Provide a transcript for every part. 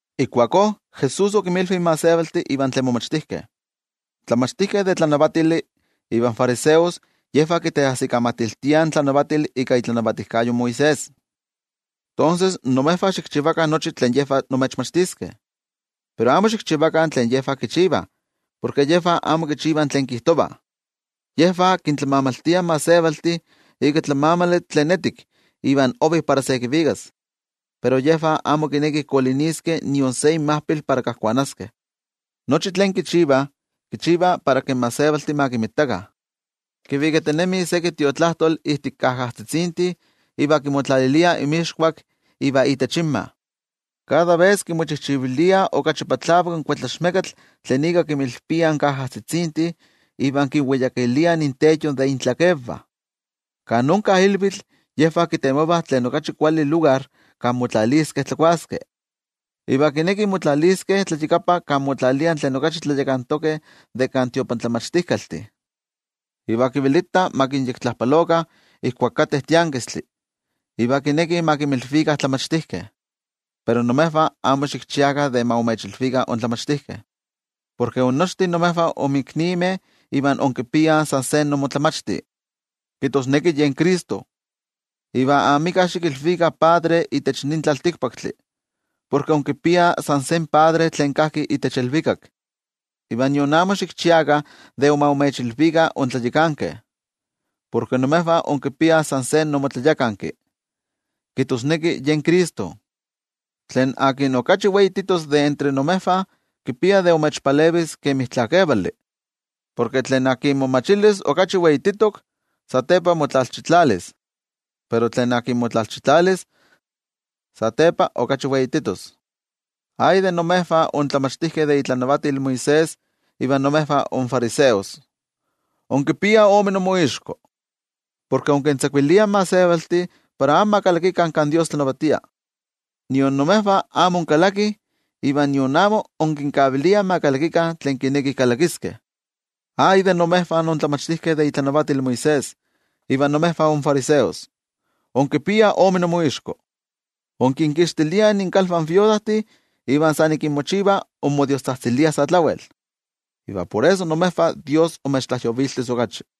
Ijkuakó Jesús okinmilvi in gentejtih iva tlen momachtijkeh: —In tlamachtijkeh de tlanavatili ivan fariseos yejvah kiteajsikamatiltiah in tlanavatili ika itlanavatijkayo Moisés. Tonses, imejvah xikchivakah nochi tlen yejvah imechmachtiskeh, pero amo xikchivakah tlen yejvah kichivah porke yejvah amo kichivah tlen kijtovah. Yejvah kintlamamaltiah in gentejtih ika tlamamali tlen etik iva ovi para se kivikas, pero yejvah amo kinekih koliniskeh nion se inmajpil para kajkuanaskeh. Nochi tlen kichivah, kichivah para ma kinmitakah in gentejtih. Kivikatinemih seki Tiotlajkuiloli ijtik kajajtzitzintih iva kimotlaliliah inmixkuak iva itech inmah. Kada ves kimochijchiviliah okachi patlavak in kuetlaxmekatl tlen ika kinmilpiah in kajajtzitzintih iva kinweyakiliah intenyo de intlakenvah. Kan onka ilvitl yejvah kitemovah tlen okachi kuali lugar kan motlaliskeh tlakuaskeh. Iva kinekih motlaliskeh tlayakapa kan motlaliah tlen okachi tlayakantokeh de kan tiotlamachtijkaltih. Iva kivelitah ma kinyektlajpalokah ijkuak kateh tiankistli iva kinekih ma kinmilvikah tlamachtijkeh. ’Pero imejvah amo xikchiakah de ma imechilvikah intlamachtijkeh, porke innochtin imejvah inmiknimeh iva inkipiah san se imoTlamachti, kijtosneki yen Cristo. Iva amika xikilvikah padre itech nin tlaltikpaktli, porke inkipiah san se Padre tlen kajki itech ilvikak. Iva nion amo xikchiakah de ma imechilvikah intlayakankeh, porke imejvah inkipiah san se imoTlayakanki, kijtosneki yen Cristo. Tlen okachi weititos de entre imejvah, kipia de imechpalevis kemi tlakevali. Porke tlen momachilis okachi weititok, satepa kitlalchitlaliskeh. Pero tlen motlalchitlalis, satepa kiweijkatlaliskeh. ’¡Ay de imejvah intlamachtijkeh de itlanavatil Moisés iva imejvah infariseos, inkipiah ome inmoixko! Porke inkintzakuiliah in gentejtih para amo ma kalakikah kan Dios tlanavatia. Nion imejvah amo inkalakih, iva nion amo inkinkaviliah ma kalakikah tlen kinekih kalakiskeh. ’¡Ay de imejvah intlamachtijkeh de itlanavatil Moisés iva imejvah infariseos, inkipiah ome inmoixko! Inkinkixtiliah inkalvah in iknosivameh, iva san ik inmochivah wejkavitl inmodiostzajtziliah. Iva por eso imejvah Dios imechtlajyoviltis okachi.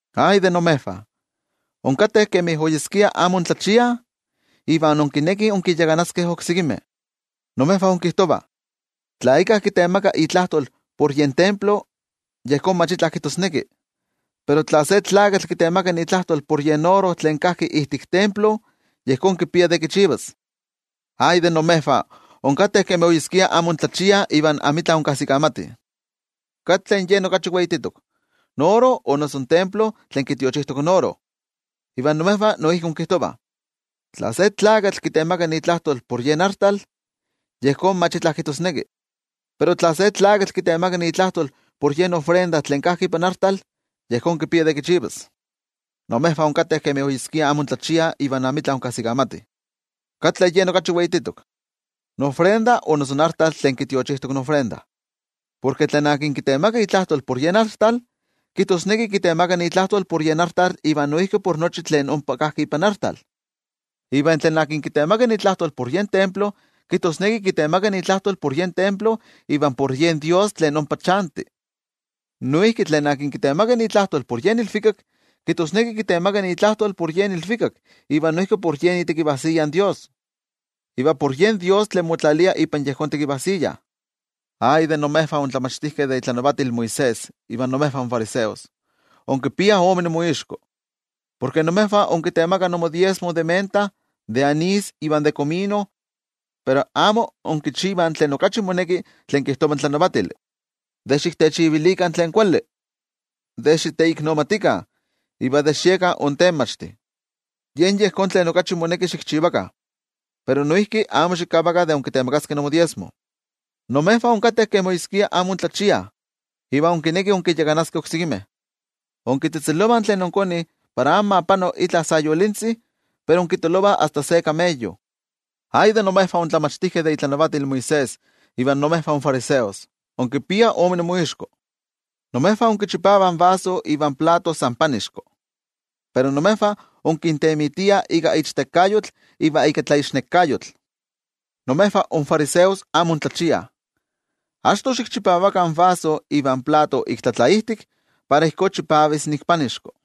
’¡Ay de imejvah, inkateh kemi oyeskia amo intlachiah iva inkinekih inkinyakanaskeh oksekimeh! Imejvah inkijtovah: “Tla íkka kitemaka itlajtol por yen templo, yejón mach itla kijtosneki. Pero tla se tlakatl kitemaka itlajtol por yen oro tlen kajki ijtik templo, yejón kipia de kichivas.” ¡Ay de imejvah, inkateh kemi oyeskia amo intlachiah iva amitla inkajsikamatih! ¿Katli yen okachi weititok: in oro o noso in templo tlen kitiochijtok in oro? Iva imejvah noijki inkijtovah: “Tla se tlakatl kitemaka itlajtol por yen artal, yejón mach itla kijtosneki. Pero tla se tlakatl kitemaka itlajtol por yen tlamanali tlen kajki ipan artal, yejón kipia de kichivas.” ¡Imejvah inkateh kemi oyeskia amo intlachiah iva amitla inkajsikamatih! ¿Katli yen okachi weititok: in tlamanali o noso in artal tlen kitiochijtok in tlamanali? Porke tlen kitemaka itlajtol por yen artal, kijtosneki kitemaka itlajtol por yen artal iva noijki por nochi tlen ompa kajki ipan artal. Iva tlen kitemaka itlajtol por yen templo, kijtosneki kitemaka itlajtol por yen templo iva por yen Dios tlen ompa chanti. Noijki tlen kitemaka itlajtol por yen ilvikak, kijtosneki kitemaka itlajtol por yen ilvikak iva noijki por yen itekivajsiya in Dios, iva por yen Dios tlen motlalia ipan yejón tekivajsiya. ’¡Ay de imejvah intlamachtijkeh de itlanavatil Moisés iva imejvah infariseos, inkipiah ome inmoixko! Porke imejvah inkitemakah imodiezmo de menta, de anís iva de komino. Pero amo inkichivah tlen okachi moneki tlen kijtova in tlanavatili, de xiktechivilikah tlen kuali, de xiteiknomatikah, iva de xiekah intenmachtih. Yen yejón tlen okachi moneki xikchivakah, pero noijki amo xikavakah de inkitemakaskeh imodiezmo. ¡Imejvah inkateh kemi oyeskia amo intlachiah iva inkinekih inkinyakanaskeh oksekimeh! ¡Inkitzejtzelovah tlen inkonih para amo ma pano itla sayolintzi, pero inkitolovah asta se kameyo! ’¡Ay de imejvah intlamachtijkeh de itlanavatil Moisés iva imejvah infariseos, inkipiah ome inmoixko! Imejvah inkichipavah in vaso ivan plato san panixko, pero imejvah inkintemitiah ika ichtekayotl iva ika tlaixnekayotl. Imejvah infariseos amo intlachiah. Achto xikchipavakah in vaso ivan plato ik tlatlaijtik, para ijkó chipavis ik panixko.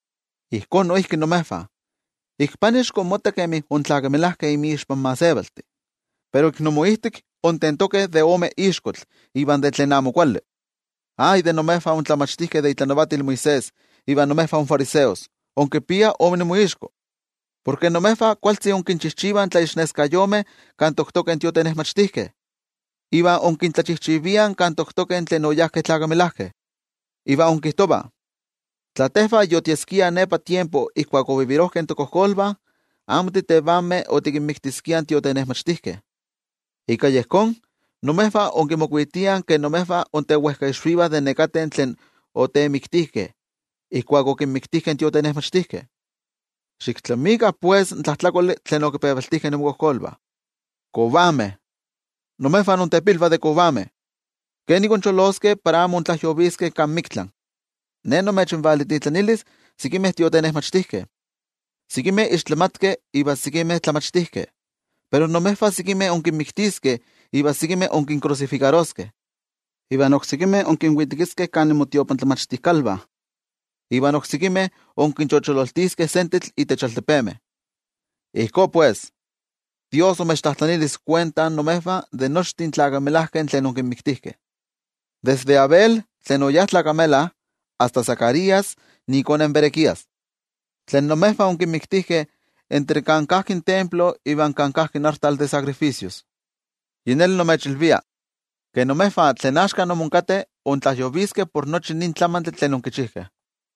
Ijkó noijki imejvah, ik panixko inmottah kemi intlakamelajkeh inmixpan gentejtih, pero imoijtik intentokeh de ome ixkotl iva de tlen amo kuali. ’¡Ay de imejvah intlamachtijkeh de itlanavatil Moisés iva imejvah infariseos, inkipiah ome inmoixko! Porke imejvah kualtzi inkinchijchivah tlaixneskayomeh kan toktokeh in tiotenejmachtijkeh, iva inkintlachijchiviah kan toktokeh tlen oyajkeh tlakamelajkeh. Iva inkijtovah: “Tla tejvah yotieskiah nepa tiempo ijkuak okatkah tokojkolvah, amo titevanmeh otikinmiktiskiah in tiotenejmachtijkeh.” Ika yejón, imejvah inkimokuitiah ke imejvah intewejkaixvivah de nekateh tlen otemiktijkeh, ijkuak okinmiktijkeh in tiotenejmachtijkeh. Xiktlamikah pues in tlajtlakoli tlen okipevaltijkeh imokojkolvah. ’¡Kovameh! ¡Imejvah intepilvah de kovameh! ¿Kenik incholoskeh para amo intlajyoviskeh kan miktla? Ne nimechvalintitlanilis sekimeh tiotenejmachtijkeh, sekimeh ixtlamatkeh iva sekimeh tlamachtijkeh. Pero imejvah sekimeh inkinmiktiskeh iva sekimeh inkinkrusifikaroskeh, iva oksekimeh inkinvitekiskeh kan inmotiotlamachtijkalvah, iva oksekimeh inkinchochololtiskeh sentetl itech altepemeh. Ijkó pues, Dios imechtlajtlanilis kuenta imejvah de nochtin tlakamelajkeh tlen okinmiktijkeh, desde Abel tlen oyá tlakamela asta Zacarías ikone in Berequías, tlen imejvah onkimiktijkeh entre kan kajki in templo iva kan kajki in artal de sacrificios. Yi neli nimechilvia, ke imejvah tlen axka imonkateh intlajyoviskeh por nochi nin tlamantli tlen onkichijkeh.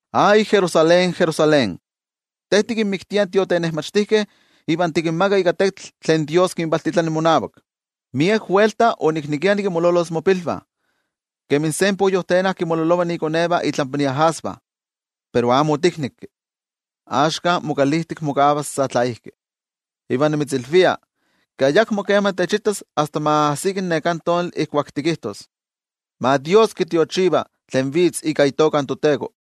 ’¡Ay, Jerusalén, Jerusalén, te tikinmiktia in tiotenejmachtijkeh iva tikinmaga ika tetl tlen Dios kivalintitlani monavak! ¡Miek welta oniknekia nikinmololos mopilvah, kemi se poyojtena kinmololova ikonevah itlampa iajasvah, pero amo otiknekki! Axka mokalijtik mokavas sa tlaijki. Iva nimitzilvia, ke ayakmo kema techitas asta ma ajsiki neká tonali ijkuak tikijtos: “¡Ma Dios kitiochiva tlen vitz ika itoka in toTeko!”